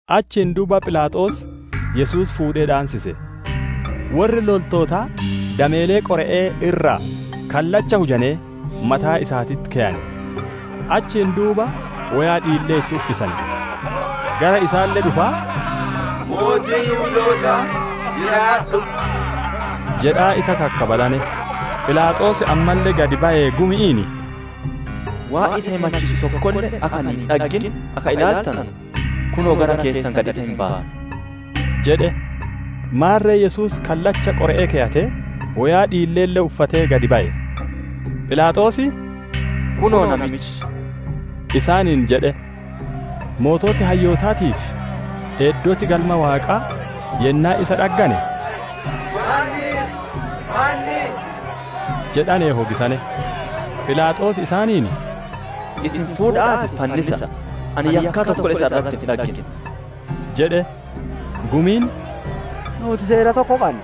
Achiin duuba Philaaxoos Yesuus fuudhee dhaansise. Worri loltootaa dameelee qore'ee irraa kallacha hujanee mataa isaatitti keyane; achiin duuba woyaa dhiillee itti uffisane. Gara isaalle dhufaa, «Mootii Yihudootaa jiraadhu!» jedhaa isa kakkabalane. Philaaxoos ammalle gad bayee gumi'iin, «Waan isa himachiisu tokkolle akka ani hin dhaggin akka ilaaltanu, kunoo, gara keessan gad isa hin baasa» jedhe. Maarre Yesuus kallacha qore'ee keyatee, woyaa dhiilleelle uffatee gad baye. Philaaxoos, «Kunoo! Namichi!» isaaniin jedhe. Sooreyyiin hayyootaatii fi eeddoti Galma Waaqaa yennaa isa dhaggane, «Fannis! Fannisi!» jedhanee hogisane. Philaaxoos isaaniin, «Isin fuudha'aatii, fannisa'a. Ani yakkaa tokkolle isa irratti hin dhaggine» jedhe. Gumiin, «Nuuti seera tokko qanna;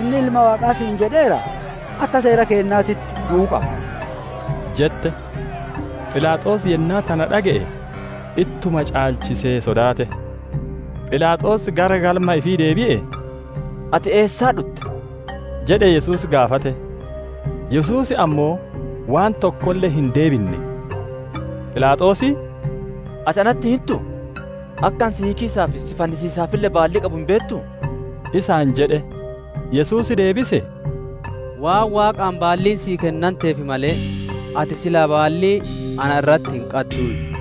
inni Ilma Waaqaa ifi godheera, akka seera keennaatitti du'uu qaba» jette. Philaaxoos yennaa tana dhage'e, ittuma caalchisee sodaate. Philaaxoos gara galma ifii deebi'ee, «Ati eessaa dhutte?» jedhee Yesuus gaafate. Yesuus ammoo waan tokkolle hin deebinne. Philaaxoos, «Ati natti hin hintuu? Akka ani si hiikiisaa fi si fannisiisaafille baallii qabu hin beettuu?» isaan jedhe. Yesuus deebisee, «Waan Waaqaan baalliin sii kennanteef malee, ati silaa baallii na irratti hin qadduuyyu.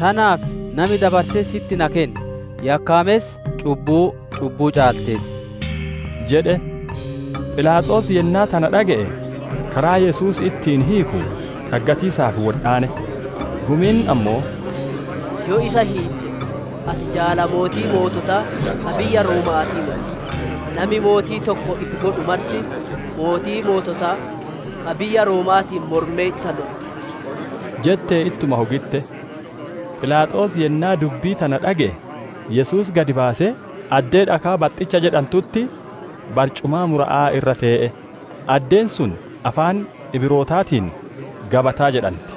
Tanaaf nami dabarsee sitti na kenne, yakkaamessa cubbuu cubbuu caaltee ti» jedhe. Philaaxoos yennaa tana dhage'e, karaa Yesuus ittiin hiiku dhaggatiisaaf wodhaane. Gumiin ammoo, «Yoo isa hiitte, ati jaala mootii moototaa, ka biyya Rooma'aatii moti; nami mootii tokko ifi godhu marti, mootii moototaa, ka biyya Rooma'aatiin mormee isa lolu» jettee ittuma hogitte. Philaaxoos yennaa dubbii tana dhage'e, Yesuus gad baasee, addee dhakaa baxxicha jedhantutti barcumaa mura'a irra tee'e; addeen sun afaan Ibrootaatiin, «Gabataa» jedhanti.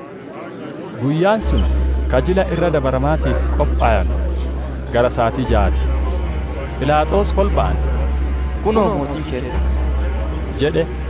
Guyyaan sun ka Jila Irra Dabaramaatiif qophowanu, gara saatii jaa ti. Philaaxoos kolba'aan, «Kunoo, mootiin keessan» jedhe.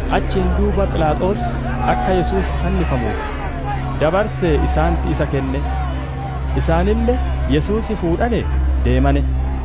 Achiin duuba Philaaxoos akka Yesuus fannifamuuf dabarsee isaanitti isa kenne. Isaanille Yesuus fuudhanee deemane.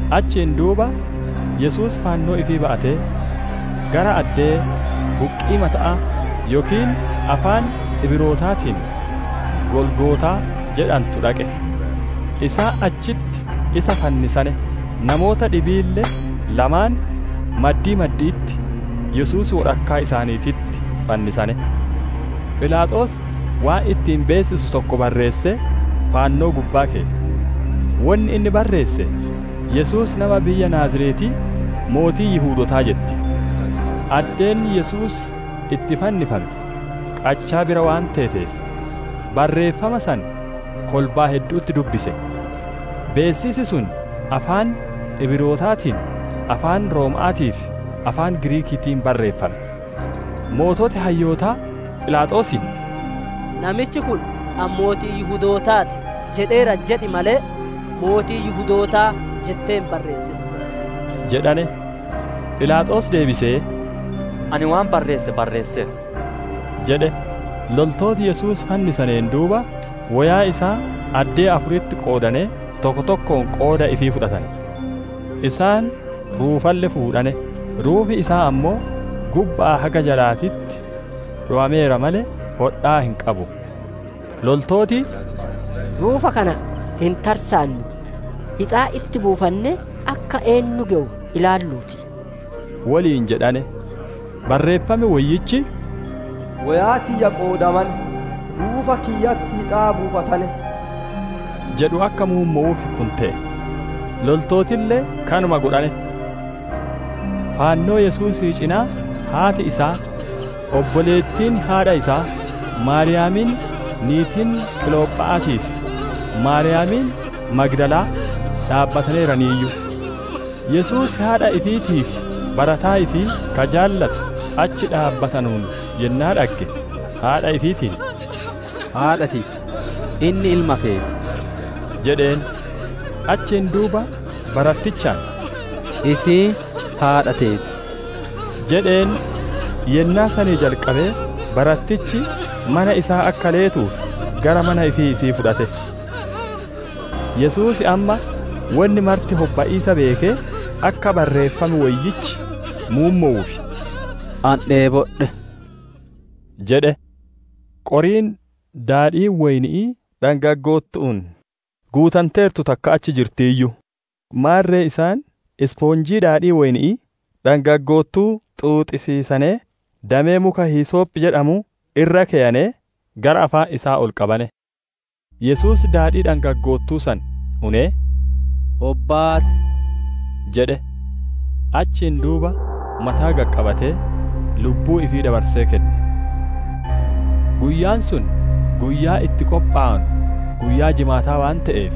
Achiin duuba Yesuus fannoo ifii ba'atee, gara addee, «Buqqii mata'aa» yookiin afaan Ibrootaatiin, «Golgootaa» jedhantu dhaqe. Isaan achitti isa fannisane; namoota dhibiille lamaan, maddii maddi'itti, Yesuus wodhakkaa isaaniititti fannisane. Philaaxoos waan ittiin beessisu tokko barreessee fannoo gubbaa keye. Wonni inni barreesse, «Yesuus nama biyya Naaziretii, mootii Yihudootaa» jetti. Addeen Yesuus itti fannifame qachaa bira waan teeteef, barreeffama san kolbaa heddu'utti dubbise. Beessisi sun afaan Ibrootaatiin, afaan Rooma'aatii fi afaan Giriikiitiin barreeffame. Sooreyyiin hayyootaa Philaaxoosiin, «Namichi kun, ‹Ani mootii Yihudootaa ti› jedheera jedhi malee, ‹Mootii Yihudootaa› jettee hin barreessin» jedhane. Philaaxoos deebisee, «Ani waan barreesse barreesseera» jedhe. Loltooti Yesuus fannisaneen duuba, woyaa isaa addee afuritti qoodanee, tokko tokkoon qooda ifii fudhatane. Isaan ruufalle fuudhane; ruufi isaa ammoo gubba'aa haga jalaatitti dhowameera malee, hodhaa hin qabu. Loltooti, «Ruufa kana hin tarsaannu; hixaa itti buufannee, akka eennu gewu ilaalluu ti!» woliin jedhane. Barreeffam Woyyichi, «Woyaa tiyya qoodamane, ruufa kiyyatti hixaa buufatane» jedhu akka muummowuuf kun te'e. Loltootille kanuma godhane. Fannoo Yesuusii cinaa, haati isaa, obboleettiin haadha isaa, Maariyaamiin niitiin Qilopha'aatii fi Maariyaamiin Magdalaa dhaabbataneeraniiyyu. Yesuus haadha ifiitii fi barataa ifii ka jaalattu achi dhaabbatanuun yennaa dhagge, haadha ifiitiin, «Haadha tiyya, inni ilma keeti» jedheen. Achiin duuba barattichaan, «Isiin haadha teeti» jedheen. Yennaa sanii jalqabee barattichi mana isaa akka leetuuf gara mana ifii isii fudhate. Yesuus amma wonni marti hobba'iisa beekee, akka Barreeffam Woyyichi muummowuuf, «Ani dheebodhe» jedhe. Qoriin daadhiin woyni'ii dhangaggoottu'uun guutanteertu takka achi jirtiiyyu; maarre isaan ispoonjii daadhii woyni'ii dhangaggoottuu xuuxachiisanee, damee muka hisoophi jedhamuu irra keyanee, gara afaan isaa ol qabane. Yesuus daadhii dhangaggoottuu san unee, «Hobbaate!» jedhe. Achiin duuba mataa gad qabatee lubbuu ifii dabarsee kenne. Guyyaan sun guyyaa itti qophowanu guyyaa jimaata waan te'eef,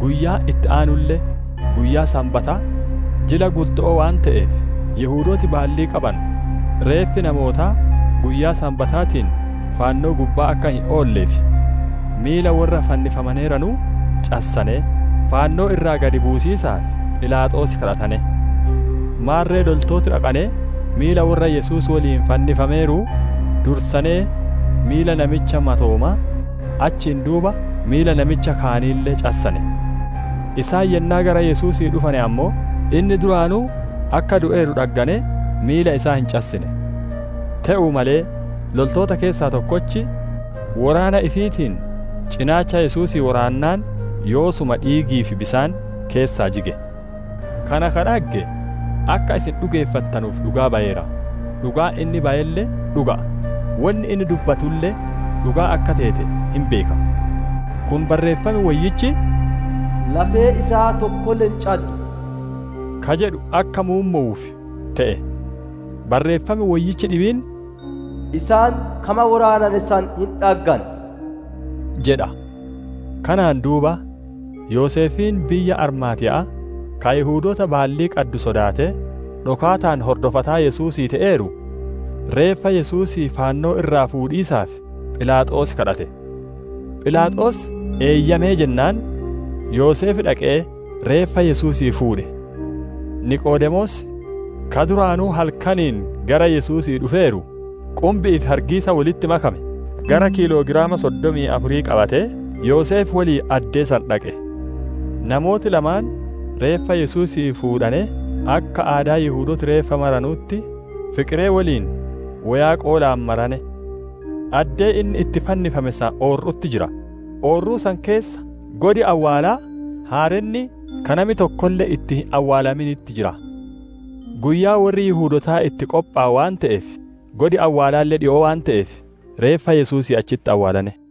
guyyaan itti aanulle guyyaa Sanbata jila guddo'oo waan te'eef, Yihudooti baallii qabanu reeffi namootaa guyyaa Sanbataatiin fannoo gubbaa akka hin oolleef, miila worra fannifamaneeranuu cassanee, fannoo irraa gad buusiisaaf, Philaaxoos gaafatane. Maarre loltooti dhaqanee miila worra Yesuus woliin fannifameeruu, dursanee miila namicha matoomaa, achiin duuba miila namicha kaaniille cassane. Isaan yennaa gara Yesuusii dhufane ammoo, inni duraanuu akka du'eeru dhagganee, miila isaa hin cassine. Te'uu malee, loltoota keessaa tokkochi, woraana ifiitiin cinaacha Yesuusii woraannaan yoosuma dhiigii fi bisaan keessaa jige. Kana ka dhagge, akka isin dhugeeffattanuuf dhugaa bayeera; dhugaan inni bayelle dhuga'a; wonni inni dubbatulle dhugaa akka teete hin beeka. Kun Barreeffam Woyyichi, «Lafeen isaa tokkolle hin caddu» ka jedhu akka muummowuuf te'e. Barreeffam Woyyichi dhibiin, «Isaan kama woraanane san hin dhaggan» jedha. Kanaan duuba, Yoseefiin biyya Armaatiya'aa, ka Yihudoota baallii qaddu sodaatee, dhokaataan hordofataa Yesuusii te'eeru, reeffa Yesuusii fannoo irraa fuudhiisaaf Philaaxoos gaafate. Philaaxoos eeyyamee jennaan, Yoseef dhaqee reeffa Yesuusii fuudhe. Niqoodemoos, ka duraanuu halkaniin gara Yesuusii dhufeeru, qumbi'ii fi hargiisa wolitti makame, gara kiiloogiraama soddomii afurii qabatee, Yoseef woliin addee san dhaqe. Namooti lamaan reeffa Yesuusii fuudhanee akka aadaa Yihudooti reeffa maranutti, fiqiree woliin woyaa qoolaan marane. Addee inni itti fannifame san oorru'utti jira; oorruu san keessa godi awwaalaa haarenni ka nami tokkolle itti hin awwaalaminitti jira. Guyyaa worri Yihudootaa itti qophowanu waan te'eef, godi awwaalaalle dhikoo waan te'eef, reeffa Yesuusii achitti awwaalane.